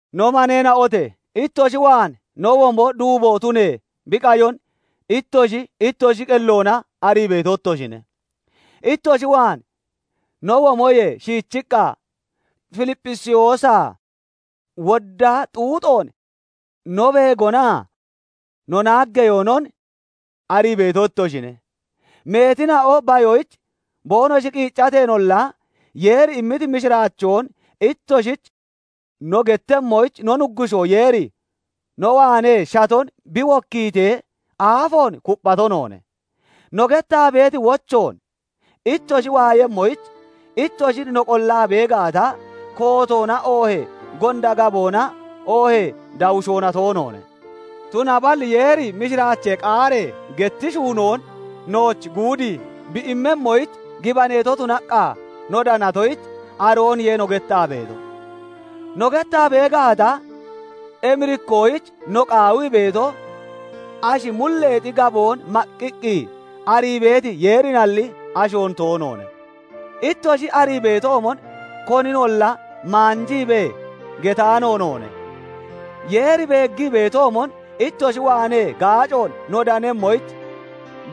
No maneena'ote! ittoshi waan no womo duubo tunee bi qayon ittoshi ittoshi qelloona arii beeto ittoshine. Ittoshi waan no womoyee shiichiqqa Filipphisiyoosaa wodda xuuxoon no beegonaa no naaggeyoonon arii beeto ittoshine; meetina'o bayoyich boonoshi qiiccateenolla, Yeeri immiti mishiraachoon ittoshich no gettemmoyich no Nuggushoo Yeeri no waanee shaton bi wokkiitee aafoon kupphato noone. No gettaa beeti wochoon ittoshi waayemmoyich ittoshin no qollaa bee gaata, kootoona oohee gonda gaboona oohee dawushoona toonoone. Tunaballi Yeeri mishiraachee qaaree getti shuunoon nooch guudii bi immemmoyich gibaneeto tunaqqa no danatoyich, arooniye no gettaa beeto; no gettaa bee gaata emirikkoyich no qaawii beeto, ashi mulleexi gaboon maqqiqqi arii beeti Yeerinalli, ashoon toonoone. Ittoshi arii beetoomon koninolla maanjiibee getaano noone; Yeeri beeggii beetoomon ittoshi waanee gaacoon no danemmoyich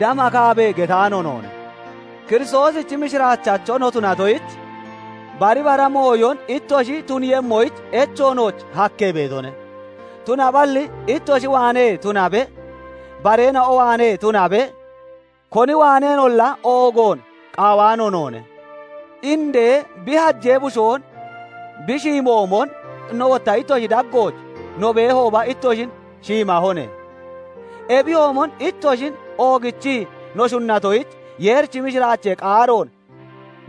damakaabee getaano noone. Kiristoosichi mishiraachacho no tunatoyich, bari bara mooyon ittoshi tuniiyemmoyich echo nooch hakkee beetone; tunaballi ittoshi waanee tunabe, bareena'o waanee tunabe, koni waaneenolla oogoon qaawaano noone; indee bi hajee bushoon bi shiimoomon, no wotta ittoshi daggooch no beehooba ittoshin shiimahone. Ebiyoomon ittoshin oogichii no shunnatoyich, Yeerichi mishiraachee qaaroon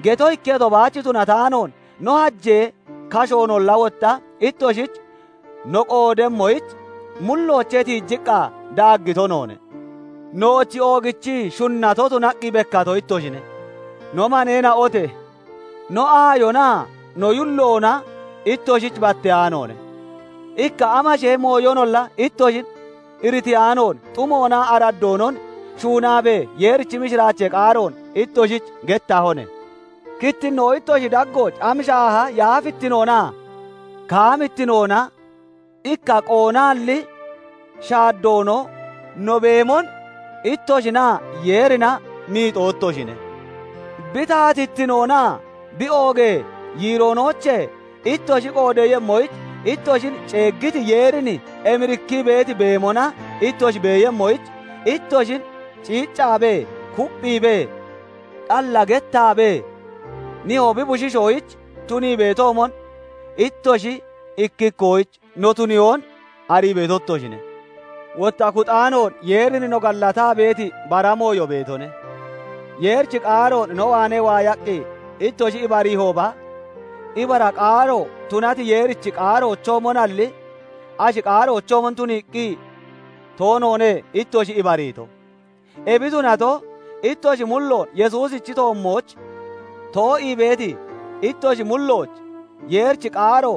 geto ikketo baach tunataanoon, no hajee kashoonolla wotta ittoshich no qoodemmoyich mulloochee tiijiqqa daaggito noone; nooch oogichii shunnato tunaqqi bekkato ittoshine. No maneena'ote! No aayonaa no yulloona ittoshich batteyaanoone; ikka amashee mooyonolla ittoshin iritiyaanoon xumoonaa araddoonon shuunaabee Yeerichi mishiraachee qaaroon ittoshich gettahone. Kittinnoo ittoshi daggooch am shaaha yaafittinoonaa kaamittinoona, ikka qoonaalli shaaddoonoo no beemon ittoshinaa Yeerina miixoo ittoshine; Bi taatittinoonaa bi oogee yiiroonoochee ittoshi qoodeeyemmoyich ittoshin ceeggiti Yeerin emirikkii beeti beemona ittoshi beeyemmoyich, ittoshin ciiccaabee, kupphiibee, xalla gettaabee, nihoo bi bushiishoyich tunii beetoomon, ittoshi ikki ikkoyich no tuniyoon arii beeto ittoshine. Wotta kuxaanoon Yeerin no gallataa beeti bara mooyo beetone; Yeerichi qaaroon no waanee waayaqqi ittoshi ibariihooba, ibara qaaro tunati Yeerichi qaaroochoomonalli, ashi qaaroochoomon tuniiqqi toonoone ittoshi ibariito; ebi tunato, ittoshi mulloon Yesuusichi toommooch too'ii beeti ittoshi mullooch Yeerichi qaaro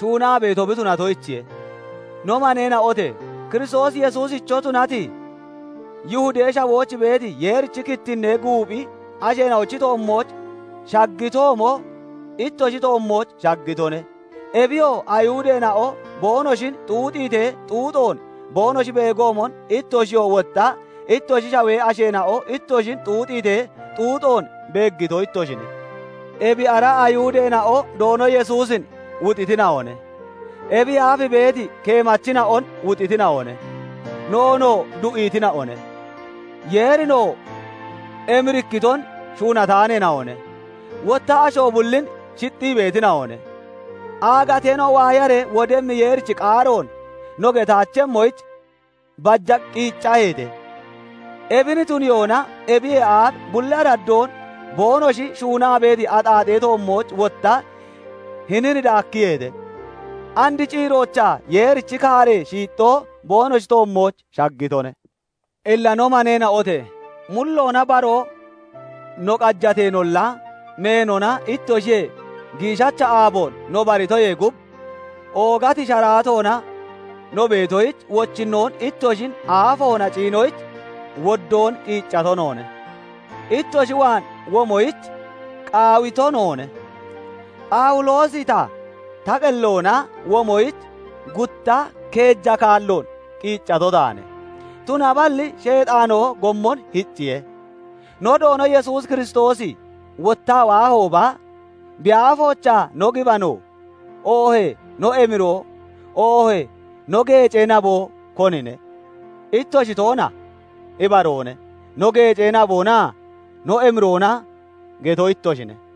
shuunaa beeto bi tunatoyichiye; No maneena'ote! Kiristoos Yesuusicho tunati, Yihudee Shawooch beeti Yeerichi kittinnee guuphi asheena'ochi toommooch shaggitoomo ittoshi toommooch shaggitone; ebiyo Ayihudeena'o boonoshin xuuxiitee xuuxoon boonoshi beegoomon, ittoshiyoo wotta ittoshi shawee asheena'o ittoshin xuuxiitee, xuuxoon beeggito ittoshine. Ebi ara Ayihudeena'o Doono Yesuusin wuxitina'one; ebiyee aaf beeti keemachina'on wuxitina'one; noonoo du'iitina'one; Yeerinoo emirikkiton shuunataaneena'one; wotta asho bullin shixxii beetina'one; aagateena'o waayaree wodemmi Yeerichi qaaroon no getaachemmoyich baja qiiccaheete. Ebin tuniyoona ebiyee aaf bulli araddoon boonoshi shuunaa beeti axaaxee toommooch wotta hinin daakkiyeete. And ciiroochaa Yeerichi kaaree shiixxoo boonoshi toommooch shaggitone. Illa no maneena'ote! Mulloona baroo no qajateenolla, meenona ittoshiyee giishacha aaboon no baritoyee gub oogati sharaatoona no beetoyich wochinnoon ittoshin aafoona ciinoyich woddoon qiiccato noone. Ittoshi waan womoyich qaawito noone. Phawuloosi ta, ta qelloona womoyich gutta keeja kaalloon qiiccato taane; tunaballi Sheexaanoo gommon hicciye. No Doono Yesuus Kiristoosi wottaa waahooba, bi aafoochaa no gibano, oohee no emiroo, oohee no geecee naboo konine? Ittoshi toona? Ibaroone; no geecee naboonaa no emiroona geto ittoshine.